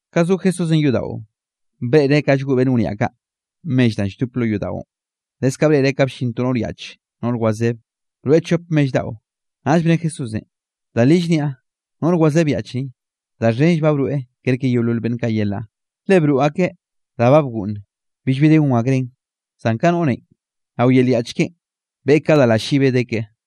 Ka zo Jesúsenꞌ yodaꞌon, breꞌreꞌ ka llgoꞌ beꞌnn wniaꞌ kaꞌ mell danꞌ lldop lo yodaꞌon. Leskaꞌ breꞌreꞌ ka bllin to noꞌr yaꞌch noꞌr wazeb, broeꞌ chop mell daꞌo. Naꞌll bne Jesúsenꞌ: —Da li llniaꞌ, noꞌr wazeb yaꞌch ni, da xhenll ba broeꞌ kerke yeolol beꞌnn kaꞌ yelaꞌ. Le broꞌ akeꞌ da ba bgoꞌnn billbi de gon akreꞌn, zan ka nak noꞌrenꞌ, rao yel yaꞌch keꞌen beꞌe ka da lallibe de keꞌe.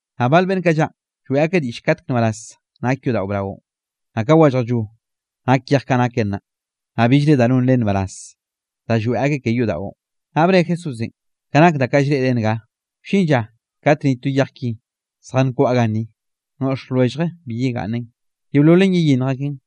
Naꞌ bal beꞌnn kaꞌ llaꞌn, lloeꞌ akeꞌ diꞌll katek nbaraz nak yodaꞌo braonꞌ, naꞌ ka wallajllo nak yej kaꞌ naken naꞌ, naꞌ billre da non len nbaraz da lloeꞌ akeꞌ ke yodaꞌon. Naꞌ bne Jesúsenꞌ: —Ka nak da kaꞌ llreꞌre nga, wllin lla kat ni to yej ki zjankwaꞌa ganni, noꞌx lwellje bi yegaꞌnnen. Yeololen yeyinnj aken.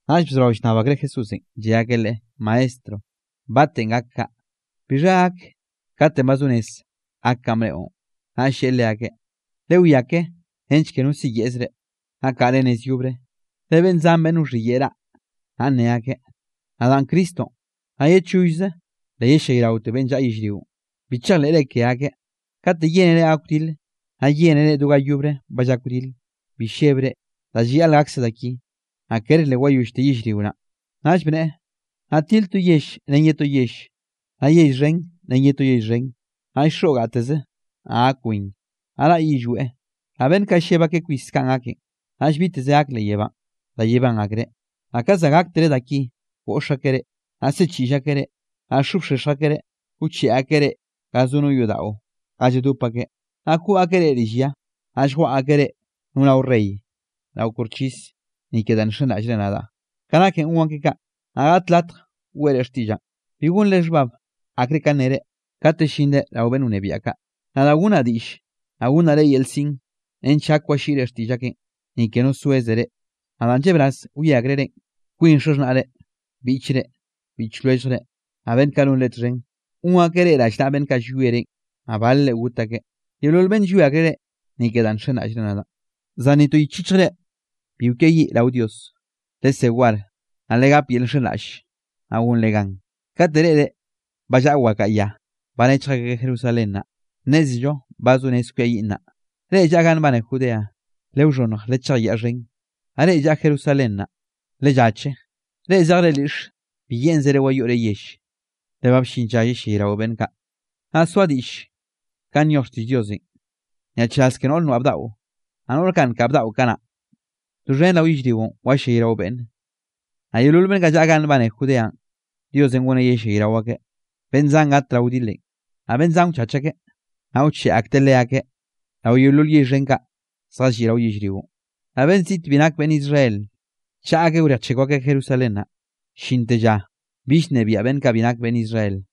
Naꞌll bzorao llnnab akreꞌ Jesúsenꞌ, lle akeꞌ Leꞌe: —Maestro, ¿batenꞌ gak kaꞌ? ¿Bixha gak katenꞌ ba zo rez gak kanꞌ bneꞌon? Naꞌll lleꞌe leakeꞌ: —Lewiá ke nench ke no siyeꞌz reꞌ, naꞌ kaꞌre nez yobre, le beꞌnn zan beꞌnn wxhiyeꞌe raꞌ, naꞌ nne akeꞌ: “Nadaꞌn Cristonꞌ”, naꞌ “Ye chollze le yellayraote beꞌnn llaꞌa yellrionꞌ.” Bi chejleꞌre ke akeꞌ. Kate yénere gak wdile, naꞌ yénere do ga yobre ba llak wdil, bi llebre, da llayaꞌl gakse da ki, naꞌ ker le wayollte yellrio naꞌn. Naꞌll bneꞌe: —Naꞌ til to yell ren ye to yell, naꞌ yell xhen ren ye to yell xhen. Naꞌll xoꞌ gateze, naꞌ gak win, naꞌ raꞌ yillweꞌ, naꞌ beꞌnn kaꞌ lleb akeꞌ kwis kanꞌ gaken, naꞌll biteze gak leꞌ yebánꞌ da yebán akreꞌ. ’Naꞌ ka za gaktere da ki, goꞌx akeꞌ reꞌ, naꞌ siꞌchiꞌll akeꞌ reꞌ, naꞌ xobxexj akeꞌ reꞌ, wcheꞌe akeꞌ reꞌ ga zo no yodaꞌo ga lladop akeꞌ, naꞌ koꞌ akeꞌ reꞌ rill ya, naꞌ lljwaꞌa akeꞌ reꞌ no rao rey, rao koxchis, ni ke danꞌ nxenraꞌllre nadaꞌ. Ka nake gon akeꞌ kaꞌ, naꞌ gaꞌt latj weꞌre xtiꞌllaꞌn. Bi gonre xhbab akre ka nnere, kate llinre rao beꞌnn wnebiaꞌ kaꞌ, nadaꞌ gonnaꞌ diꞌll, naꞌ gonnaꞌ reꞌ yel siꞌn nench gak walliꞌre xtiꞌll akeꞌn, ni ke no soeze reꞌ. Naꞌ danꞌ llebraz wie akreꞌ reꞌn, kwin xaxhnaꞌre, biꞌchre, biꞌch lwelljre, naꞌ beꞌnn kaꞌ nonre txhen, gon akeꞌ reꞌ rallnaꞌa beꞌnn kaꞌ llwie reꞌn, naꞌ balre got akeꞌ. Yeolol beꞌnn wie akreꞌ reꞌ, ni ke danꞌ nxenraꞌllre nadaꞌn, zan ni to yich yichjre bi kwiayiꞌ rao Dios. Lesé war, naꞌ legap yel llxhenraꞌlle, naꞌ gonre gan. ’Kate reꞌre ba llaꞌa wakaꞌa ya ba nechj akeꞌ Jerusalén naꞌ, nnézello ba zo rez kwiayiꞌn naꞌ. Reꞌ llaꞌa ganꞌ nbane Judeanꞌ, lewxhonnj lechej yaꞌ xhen, naꞌ reꞌ llaꞌa Jerusalén naꞌ, lellache; reꞌ zej lyiꞌxe, bi yeꞌnzere wayoꞌre yell. Le ba bllin lla yellayrao beꞌnn kaꞌ, naꞌ soa diꞌll kanꞌ nyoj xtiꞌll Diosenꞌ. ¡Nyaꞌchraz ke noꞌr noaꞌ bdaꞌo, naꞌ noꞌr nkaꞌ bdaꞌo kanaꞌ! Doxhen rao yellrionꞌ wallayrao beꞌnne, naꞌ yeolol beꞌnn kaꞌ llaꞌa ganꞌ nbane Judeanꞌ, Diosenꞌ goneꞌ yellayrao akeꞌ. Beꞌnn zan gat rao wdilenꞌ, naꞌ beꞌnn zan wchach akeꞌ, naꞌ wcheꞌe akteꞌ leakeꞌ rao yeolol yell xhen kaꞌ zjalliꞌ rao yellrionꞌ, naꞌ beꞌnn ziꞌt bi nak beꞌnn Israel, chaꞌa akeꞌ wrejchekw akeꞌ Jerusalén naꞌ, llinte lla bill nnebiaꞌ beꞌnn kaꞌ bi nak beꞌnn Israel.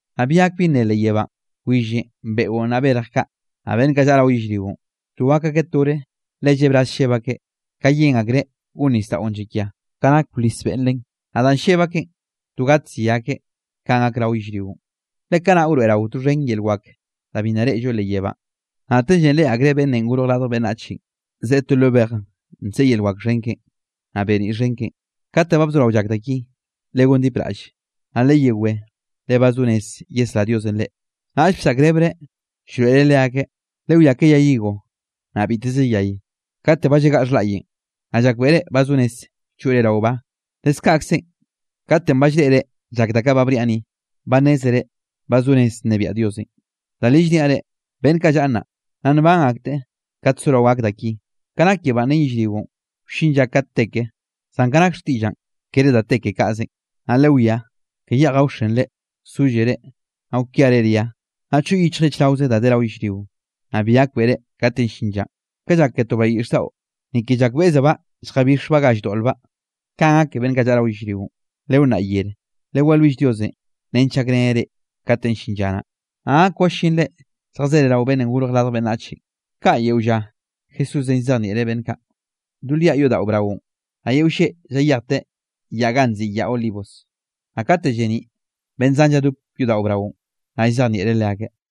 ’Naꞌ bi gak bi nne leꞌ yebánꞌ, willenꞌ, beꞌon naꞌ berj kaꞌ, naꞌ beꞌnn kaꞌ llaꞌa rao yellrionꞌ, to gak akeꞌ tore le llebraz lleb akeꞌ ka yen akreꞌ gon nisdaꞌon llakia, ka nak wlis beꞌn len. Naꞌ danꞌ lleb akeꞌn, to gatzi akeꞌ kanꞌ gak rao yellrionꞌ, le kanaꞌ wroeꞌrao doxhen yel wak da bi naꞌ reꞌllo leꞌ yebánꞌ. Naꞌtellenꞌ reꞌe akreꞌ Beꞌnnenꞌ Gorj Radj Beꞌnnachenꞌ, zeꞌe to lo bej nseꞌe yel wak xhen keꞌen, naꞌ beniꞌ xhen keꞌen. Kate ba bzorao llak da ki, legondipraꞌlle, naꞌ leyewé le ba zo rez yesrá Diosenꞌ reꞌ. Naꞌll bsaꞌkrebreꞌ llroeꞌreꞌ leakeꞌ: —Lewiá ke yay higo, naꞌ biteze yay, kate ba llagaꞌ xhlaꞌyen, naꞌ llakbeꞌre ba zo rez choꞌre rao ba. Leskaꞌkzenꞌ, katenꞌ ba llreꞌre llak da kaꞌ ba bniaꞌ ni, ba nnézere ba zo rez nnebiaꞌ Diosenꞌ. ’Da li llniaꞌ reꞌ, beꞌnn kaꞌ llaꞌa nnaꞌ, nna nban akteꞌ kate sorao gak da ki. Ka nak yebánꞌ ren yellrionꞌ wllin lla kat te ke, zan ka nake xtiꞌllaꞌn kere da te ke kaꞌzenꞌ. ’Naꞌ lewiá, ke yeꞌj gaoxenre, sollere, naꞌ kwiare ria, naꞌ choꞌ yichjre chraoze da de rao yellrionꞌ, naꞌ bi gakbeꞌre katenꞌ llin llanꞌ. Ka llak ke to bayiꞌx daꞌo, ni ke llakbeꞌzebaꞌ lljabixbaꞌ ga lldoꞌlbaꞌ, kanꞌ gak ke beꞌnn kaꞌ llaꞌa rao yellrionꞌ. Lewnnaꞌ yere, lewalwill Diosenꞌ nench gakreneꞌ reꞌ katenꞌ llin lla naꞌ, naꞌ gak wallinre lljazere rao Beꞌnnenꞌ Gorj Radj Beꞌnnach. Kaꞌ, yeo lla, Jesúsenꞌ llzejnieꞌreꞌ beꞌnn kaꞌ do liaꞌ yodaꞌo braonꞌ, naꞌ yeo lleꞌ llayejteꞌ yaꞌ ganꞌ nziꞌi Yaꞌ Olivos. Naꞌ kate lleniꞌ beꞌnn zan lladop yodaꞌo braonꞌ, naꞌ lljazejnieꞌreꞌ leakeꞌ.